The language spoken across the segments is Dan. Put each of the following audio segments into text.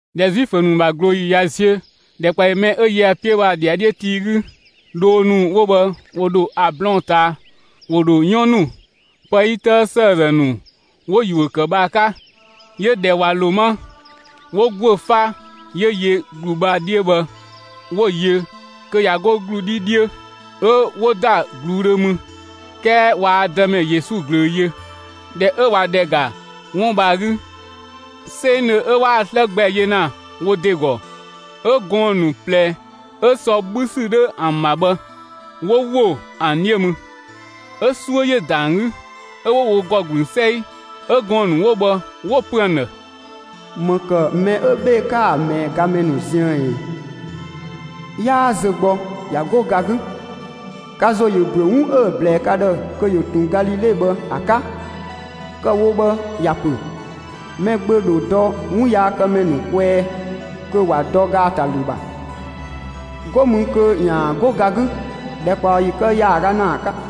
꞊Dhɛ Zuifö ‑nu ‑bha ꞊glooyi ꞊ya ziö, ‑dhɛkpaɔyi mɛ 'ö yö ‑a 'piö bhë ‑a ‑dhiadhiö tii 'gü, dhoo ‑nu 'wo bhë ‑wo ‑dho ‑a blɔɔn‑ ꞊taa; ‑wo ‑dho 'yɔn ‑nu, pë 'yi 'tëë ‑sëëzë ‑nu, 'wo‑ ‑yuö ‑kë bhë ‑a 'ka; 'yö ꞊dhɛ ꞊wa ‑lo 'ma, 'wo ‑guö 'fa 'yö yö ‑glu bhë ‑a 'dhiö bhë 'wo‑ yö kö ꞊ya 'go ‑glu 'dhi 'dhiö. 'Ö 'wo ‑da ꞊gluudhö mü, 'kɛɛ waa Dëmɛ Yesu ꞊glöö yö. ꞊Dhɛ 'ö ꞊wa ‑dhɛ ‑ga 'wun bhë ‑a 'gü 'sengdhö 'ö 'waa‑ 'slë gbɛ yö ‑na wo ‑de ‑gɔ, 'ö gɔɔn‑ ‑nu ꞊plɛ 'ö sɔ 'bhü ‑sü 'dhö ‑an ‑bha bhë, 'wo ‑wo ‑an 'dhiö mü. 'Ö 'suö ‑yö ‑da ‑an 'gü, 'ö 'wo wo ‑gɔ ‑gblü 'sɛi. 'Ö gɔɔn‑ ‑nu 'wo bhë 'wo‑ pö ‑an ‑dhë: «‑Më ‑kë 'ö mɛ 'ö 'bhee‑ 'ka‑ ꞊mɛɛ gamɛ ziën ꞊ɛ? 'Yaa zö gbɔ ꞊ya 'go ga 'gü, ka ‑zo ‑yö ‑büö 'wun 'ö‑ ꞊blɛɛ ka ‑dhë kö ‑yö ꞊tun Galile bhë ‑a 'ka. Kë‑ wo bhë ‑ya pö: Mɛgbö ‑dho dɔ 'wunyaakëmɛ ‑nu kwɛɛ kö ‑wa dɔ ‑gaatalü ‑bha. 'Go mü kö ‑yaan 'go ga 'gü ‑dhɛkpaɔyi kë ‑yaaga ‑naa 'ka!»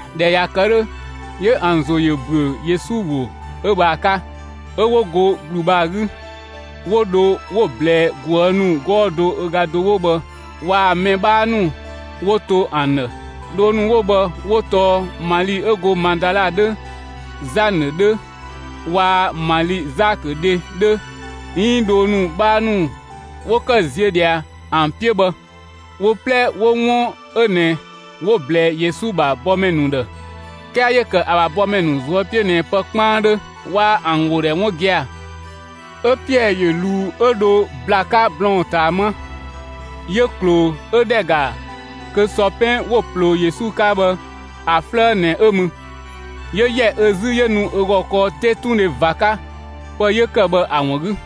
꞊Dhɛ ꞊ya kë 'dhö, 'yö ‑an ‑zo ‑yö ‑büö Yesu ‑wo 'ö bhë ‑a 'ka. 'Ö 'wo go ‑glu bhë ‑a 'gü, 'wo dho 'wo‑ ꞊blɛɛ ꞊guë' ‑nu 'gɔɔ‑ do ö ga do 'wo bhë waa‑ mɛ 'bhaa ‑nu 'wo to ‑an ‑dhë. Dhoo ‑nu 'wo bhë 'wo tɔɔ Mali 'ö go Madala 'dhö, Zanë 'dhö waa‑ Mali Zakö dhe 'dhö, 'iin dhoo ‑nu 'bhaa ‑nu 'wo ‑kë ziö ꞊dhia ‑an 'piö bhë, wo 'plɛ 'wo 'wun 'ö ꞊nɛ 'wo‑ ꞊blɛɛ Yesu ‑bha bɔmɛ ‑nu ‑dhë. 'Kɛɛ 'yö ‑kë ‑a ‑bha bɔmɛ ‑nu ꞊zuö' 'piö ꞊nɛ pë 'kpaandhö, waa ‑an ‑wo ‑dhɛ 'wun gia‑. 'Ö Piɛɛ ‑yö ꞊luu 'ö dho ‑bla 'ka blɔɔn‑ ꞊taa 'ma, 'yö ꞊kloo ö ‑dhɛ ‑ga kö sɔpɛn 'wo‑ ꞊ploo Yesu 'ka bhë ‑a 'flëë ꞊nɛ 'ö mü. 'Yö ‑yɛ ö 'zü 'yö nu ö ‑gɔ kɔɔ 'tetundhe ꞊va 'ka, pë 'yö ‑kë bhë ‑a ‑wun 'gü.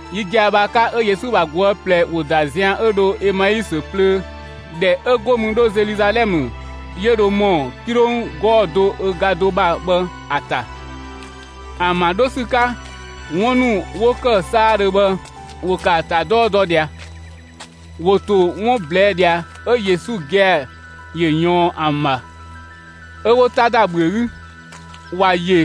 Yi gia‑ bhë ‑a 'ka 'ö Yesu ‑bha ꞊guë' ꞊plɛ ‑wo ‑da zian 'ö dho Emaisö plöö ‑dhɛ 'ö 'go mü 'dho Zeluzalɛmë 'yö dho ‑mɔ 'kilong 'gɔɔ‑ do ö ga do ‑bha bhë ‑a ‑ta. ‑An ‑bha 'dho ‑sü 'ka, 'wun ‑nu 'wo ‑kë 'saadhö bhë, ‑wo kë ‑a ‑ta 'dɔɔ dɔ ꞊dhia. ‑Wo ‑to 'wun ꞊blɛɛ' ꞊dhia, 'ö Yesu gia‑ ‑yö ‑yɔɔn ‑an ‑bha 'ö 'wo 'ta ‑da ‑bhüö 'gü. ‑Wa ‑yö,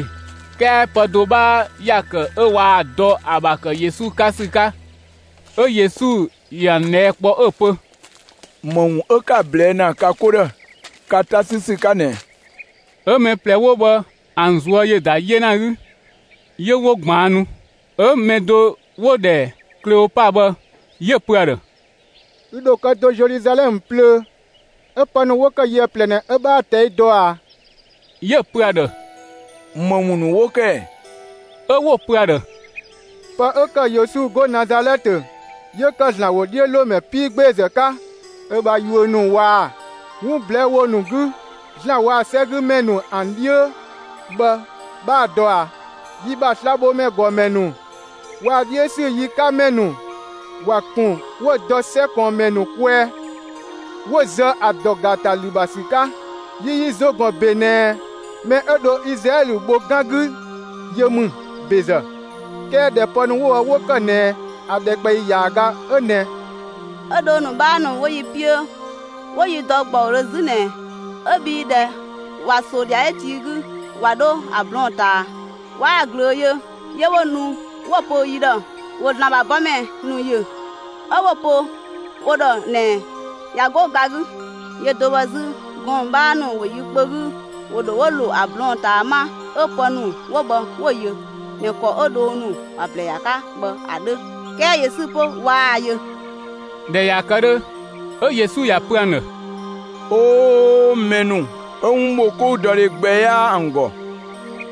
'kɛɛ pë do 'bhaa ‑ya ‑kë 'ö waa‑ dɔ ‑a ‑bha ‑kë Yesu 'ka ‑sü 'ka. 'Ö Yesu ‑yö ‑an ꞊dhɛɛ' kpɔ 'ö‑ pö: «‑Më ‑wun 'ö 'ka‑ ꞊blɛɛ' ‑na ka 'ko ‑dhë 'ka 'ta 'sü ‑sü 'ka ꞊nɛɛ?» 'Ö mɛ ꞊plɛ 'wo bhë, ‑an ꞊zuö' ‑yö ‑da 'yena 'gü, 'yö 'wo ꞊gbaannu. 'Ö‑ mɛ do 'wo‑ ‑dhɛ Kleopa bhë 'yö‑ pö ‑a ‑dhë: «Ü ‑dho kë do 'ö Zeluzalɛmë plöö, 'ö pë ‑nu 'wo kë yië ꞊plɛ ꞊nɛ 'ö 'bhaa‑ ꞊tɛi' dɔ ꞊a?» 'Yö‑ pö ‑a ‑dhë: «‑Më ‑wun ‑nu 'wo ‑kë ‑ɛ?» 'Ö 'wo‑ pö ‑a ‑dhë: «Pë 'ö ‑kë Yesu 'go Nazalɛtë 'yö ‑kë ‑Zlan ‑wodhiölomɛ 'piigbeezë 'ka ö bha yuö ‑nu waa‑ 'wun ꞊blɛɛ' ‑wo ‑nu 'gü ‑Zlan waa‑ 'sɛgümɛ ‑nu ‑an 'dhiö bhë 'bhaa‑ dɔ ꞊a? Yi ‑bha slabhomɛ ‑nu ‑gɔmɛ ‑nu waa‑ 'dhiö ‑sü yi 'ka ‑mɛ ‑nu ‑wa ‑kun 'wo‑ dɔ 'sɛ ꞊kɔɔnmɛ ‑nu kwɛɛ 'wo‑ zë ‑a ‑dɔ ‑gaatalü ‑bha ‑sü 'ka. Yi yi ‑zo ‑gɔn ‑be ꞊nɛ, mɛ 'ö dho Izlaɛlö bho 'gan 'gü 'yö ‑mü ‑bezë; 'kɛɛ ꞊dhɛ pë ‑nu 'wo bhë 'wo ‑kë ꞊nɛ ‑a ‑dhɛkpaɔyi ‑yaaga 'ö ꞊nɛ. 'Ö dhoo ‑nu 'bhaa ‑nu 'wo yi 'piö 'wo yi dɔ ‑gbɔudhö 'zü ꞊nɛɛ, 'ö bhii ꞊dhɛ ꞊wa ‑so ‑dhiadhiö tii 'gü ꞊wa 'dho ‑a blɔɔn‑ ꞊taa, waa‑ ꞊glöö yö; 'yö 'wo nu 'wo‑ pö yi ‑dhë wo ‑Zlan ‑bha bɔmɛ ‑nu ‑yö, 'ö 'wo‑ pö wo ‑dhë ꞊nɛ ꞊ya 'go ga 'gü. Yö do bhë 'zü, gɔɔn‑ 'bhaa ‑nu 'wo yi kpö 'gü ‑wo dho 'wo ‑lo ‑a blɔɔn‑ ꞊taa 'ma 'ö pë ‑nu 'wo bhë 'wo‑ yö ꞊nɛ ‑kɔ 'ö dhoo ‑nu ‑wa ꞊blɛɛ ‑a 'ka bhë ‑a 'dhö, 'kɛɛ Yesu 'pö waa‑ yö.» ꞊Dhɛ ꞊ya kë 'dhö, 'ö Yesu ‑ya pö ‑an ‑dhë: «'Oo gɔɔn‑ ‑nu 'ö 'wunbhokoudɔdhe gbɛ 'yaa ‑an ‑gɔ,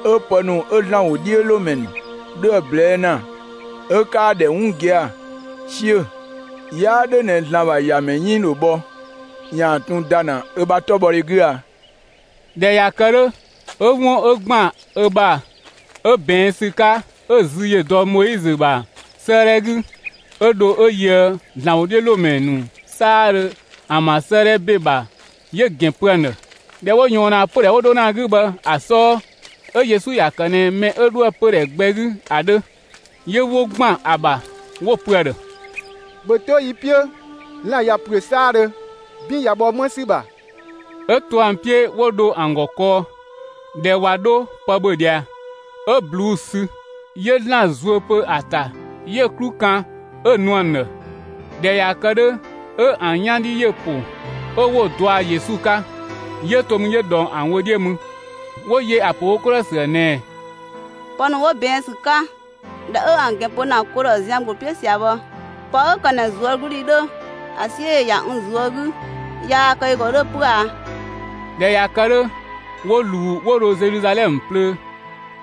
'ö pë ‑nu 'ö ‑Zlan ‑wodhiölomɛ ‑nu 'dho ‑a ꞊blɛɛ' ‑na, 'ö 'kaa‑ ‑dhɛ 'wun gia‑ 'siö‑! 'Yaa 'dhö ꞊nɛ ‑Zlan ‑bha ‑Yamɛ 'yënng ‑dho bhɔ ‑yaan ꞊tun ‑da ‑na ö ‑bha 'tɔbhɔdhe 'gü a?» ꞊Dhɛ ꞊ya kë 'dhö, 'ö 'wun 'ö ‑gban ö ‑bha 'ö ꞊bɛɛn' ‑sü 'ka 'ö‑ zü ‑yö dɔ Moizö ‑bha 'sëëdhɛ 'gü 'ö dho 'ö yöë ‑Zlan ‑wodhiölomɛ ‑nu 'saadhö ‑an ‑bha 'sëëdhɛ ‑be ‑bha, 'yö‑ ‑gɛn pö ‑an ‑dhë. ꞊Dhɛ 'ö 'wo ꞊yɔɔn ‑na pödhɛ 'wo 'dho ‑na ‑a 'gü bhë ‑a 'sɔɔ, 'ö Yesu ‑ya kë ꞊nɛ mɛ 'ö 'dhoë‑ pödhɛ gbɛ 'gü ‑a 'dhö. 'Yö 'wo‑ ‑gban ‑a ‑bha 'wo‑ pö ‑a ‑dhë: «‑Bhö 'to yi 'piö, lan‑ ꞊ya ‑püö 'saadhö, 'bin ꞊ya bhɔ 'më ‑sü ‑bha!» 'Ö to ‑an 'piö 'wo dho ‑an ‑gɔ kɔɔ. ꞊Dhɛ ꞊wa 'dho pë ‑bhö ꞊dhia, 'ö ꞊bluu'‑ sü, 'yö ‑Zlan zuö pö ‑a ‑ta, 'yö‑ 'klu kan 'ö‑ nu ‑an ‑dhë. ꞊Dhɛ ꞊ya kë 'dhö, 'ö ‑an 'yan 'dhi ‑yö ‑po, 'ö 'wo‑ dɔa Yesu 'ka. 'Yö to mü 'yö ꞊dhɔng ‑an wö 'dhiö mü. 'Wo yö ‑a ‑pö wo 'ko ‑dhë ‑sü ‑bha ꞊nɛɛ: «Pë ‑nu 'wo ꞊bɛɛn' ‑sü 'ka, ꞊dhɛ 'ö ‑an ‑gɛn pö ‑na ko ‑dhë zian ‑gbloo 'piö ꞊sia bhë, pë 'ö ‑kë ꞊nɛ ꞊zuögludhi 'dhö ‑a 'siö ‑yö ‑ya n ꞊zuö' 'gü, (꞊yaa‑ kë ü ‑gɔ 'dhö 'pö a)?» ꞊Dhɛ ꞊ya kë 'dhö, 'wo ꞊luu 'wo dho Zeluzalɛmë plöö,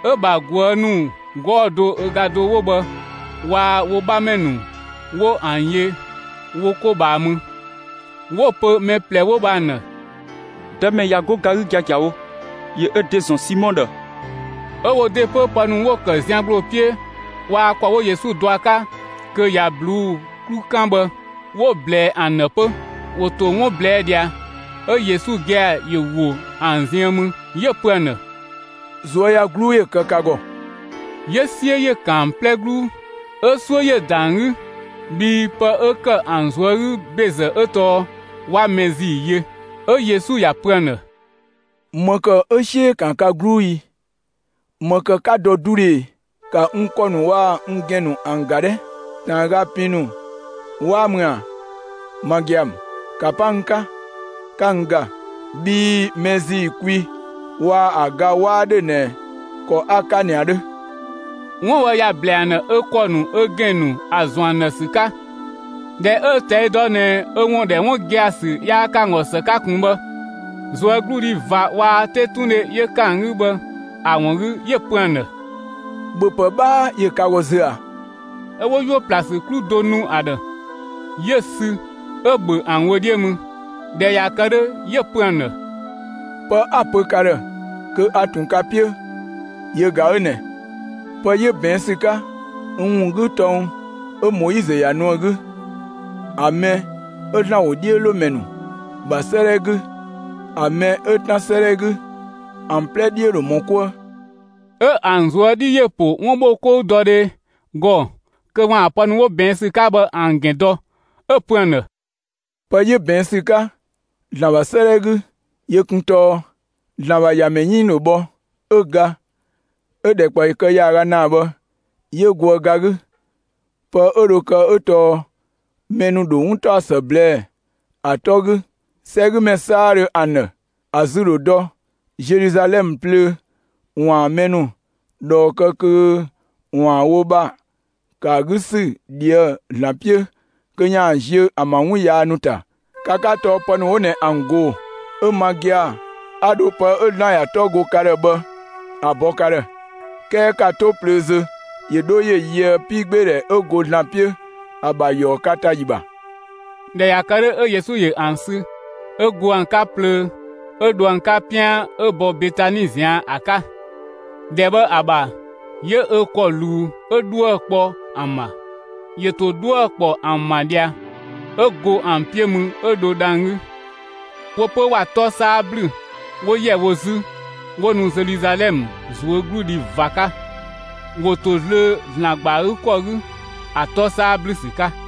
'ö‑ ‑bha ꞊guë' ‑nu 'gɔɔ‑ do ö ga do 'wo bhë waa‑ wo 'bhamɛ ‑nu 'wo ‑an yö wo 'ko ꞊bhaa mü, 'wo‑ pö mɛ ꞊plɛ 'wo bhë ‑an ‑dhë: «Dëmɛ ꞊ya 'go ga 'gü giagiawo, ‑yö ö ‑de ‑zɔn Simɔ ‑dhë!» 'Ö wo ‑de 'pö pë ‑nu 'wo ‑kë zian ‑gbloo 'piö waa‑ ‑kɔ 'wo Yesu dɔ ‑a 'ka kö ꞊ya ꞊bluu'‑ 'klu 'kan bhë, 'wo‑ ꞊blɛɛ ‑an ‑dhë 'pö. ‑Wo ‑to 'wun ꞊blɛɛ' ꞊dhia, 'ö Yesu gia‑ ‑yö ‑wo ‑an ziën mü, 'yö‑ pö ‑an ‑dhë: «꞊Zuöyagluu ‑yö kë ka ‑gɔ!» 'Yö 'siö ‑yö ‑kan ‑an 'plɛ 'gluu, 'ö 'suö ‑yö ‑da ‑an 'gü, bhii pë 'ö ‑kë ‑an ꞊zuö' 'gü ‑bezë 'ö tɔɔ 'wa mɛ ‑zii yö. 'Ö Yesu ‑ya ‑pö ‑an ‑dhë: «‑Më ‑kë 'ö 'siö ‑yö ‑kan ka 'gluu i? ‑Më ‑kë 'ka dɔ 'dudhö ꞊e? ‑Ka n ‑kɔ ‑nu waa‑ n ‑gɛn ‑nu ‑an ‑ga 'dhɛ! ꞊Taanga pin ‑nu 'waa ‑mü ‑a? Ma gia‑ ‑mü! ‑Ka 'pa n 'ka, 'ka n ‑ga, bhii mɛ ‑zii kwi waa‑ ‑a ga 'waa ‑dhö ꞊nɛ ‑kɔ 'a‑ 'ka ꞊nɛ ‑a 'dhö!» 'Wun bhë ‑ya ‑blɛɛ ‑an ‑dhë ö ‑kɔ ‑nu, ö ‑gɛn ‑nu ‑a ‑zɔn ‑an ‑dhë ‑sü 'ka. ꞊Dhɛ 'ö‑ ꞊tɛi' dɔ ꞊nɛ ö ‑wun ‑dhɛ 'wun gia‑ ‑sü yaa kë ‑an ‑gɔ ‑së 'ka ꞊kun bhë, ꞊zuögludhi ꞊va waa‑ 'tetundhe 'yö ‑kë ‑an 'gü bhë ‑a ‑wun 'gü, 'yö‑ pö ‑an ‑dhë: «‑Bhöpë 'bhaa ‑yö ka ‑gɔ zö ꞊a?» 'Ö 'wo 'yuö‑ ‑pla ‑sü 'klu do nu ‑a ‑dhë. 'Yö‑ sü 'ö‑ ‑bhö ‑an wö 'dhiö mü. ꞊Dhɛ ꞊ya kë 'dhö, 'yö‑ pö ‑an ‑dhë: «Pë 'a‑ pö ka ‑dhë kö a ꞊tun ka 'piö yö ꞊ga 'ö ꞊nɛ: Pë 'yö ꞊bɛɛn' ‑sü 'ka n ‑wun 'gü tɔng 'ö Moizö ‑ya nu ‑a 'gü, ‑a mɛ 'ö ‑Zlan ‑wodhiölomɛ ‑nu ‑bha 'sëëdhɛ 'gü, ‑a mɛ 'ö 'Tan 'sëëdhɛ 'gü, ‑an 'plɛ 'dhiö ‑dho ‑mɔ 'kuë.» 'Ö ‑an ꞊zuö' 'dhi ‑po 'wunbhokoudɔdhe ‑gɔ kö ‑waan pë ‑nu 'wo ꞊bɛɛn' ‑sü 'ka bhë ‑an ‑gɛn dɔ. 'Ö‑ pö ‑an ‑dhë: «Pë 'yö ꞊bɛɛn' ‑sü 'ka ‑Zlan ‑bha 'sëëdhɛ 'gü, yö kun tɔɔ: ‑Zlan ‑bha ‑Yamɛ 'yënng ‑dho bhɔ, 'ö ga, 'ö‑ ‑dhɛkpaɔyi kë ‑yaaga ‑naa bhë 'yö goë ga 'gü. Pë 'ö dho kë 'ö tɔɔ mɛ ‑nu ‑dho 'wuntaɔsë ꞊blɛɛ'‑ ‑a 'tɔ 'gü 'sɛgümɛ 'saadhö ‑an ‑dhë; ‑a zü ‑dho dɔ Zeluzalɛmë plöö ‑waan mɛ ‑nu ꞊dhɔɔ kë kö ‑waan wo ‑bha ‑kë ‑a 'gü ‑sü ꞊dhië' ‑Zlan 'piö kö ‑yaan ziö ‑an ‑bha ‑wun yaa ‑nu ‑ta. Ka 'ka tɔɔ pë ‑nu 'wo ꞊nɛ ‑an ꞊goo‑. 'Ö ma gia‑ 'a dho pë 'ö ‑Zlan ‑ya 'tɔ go ka ‑dhë bhë ‑a bɔ ka ‑dhë. 'Kɛɛ ‑ka 'to plöö zö ‑yö 'dho ‑yö yöë 'piigbeedhɛ 'ö go ‑Zlan 'piö ‑a ‑bha ‑yɔɔ ka ‑ta ‑yi ‑bha.» ꞊Dhɛ ꞊ya kë 'dhö, 'ö Yesu ‑yö ‑an sü 'ö go ‑an 'ka plöö 'ö dho ‑an 'ka 'pian 'ö bɔ Betani ꞊zian' ‑a 'ka. ‑Dhɛ bhë ‑a ‑bha 'yö ö ‑kɔ ꞊luu 'ö 'dhuë‑ kpɔ ‑an ‑bha. ‑Yö ‑to 'dhuë‑ ‑kpɔ ‑an ‑bha ꞊dhia, 'ö go ‑an 'piö mü 'ö dho dhang‑ 'gü. Wo 'pö ‑wa 'tɔ 'saa ‑blü, 'wo ‑yɛ wo 'zü, 'wo nu Zeluzalɛmë ꞊zuögludhi ꞊va 'ka; ‑wo ‑to zlöö ‑Zlan ‑gba ‑a 'gü ‑kɔ 'gü ‑a 'tɔ 'saa ‑blü ‑sü 'ka.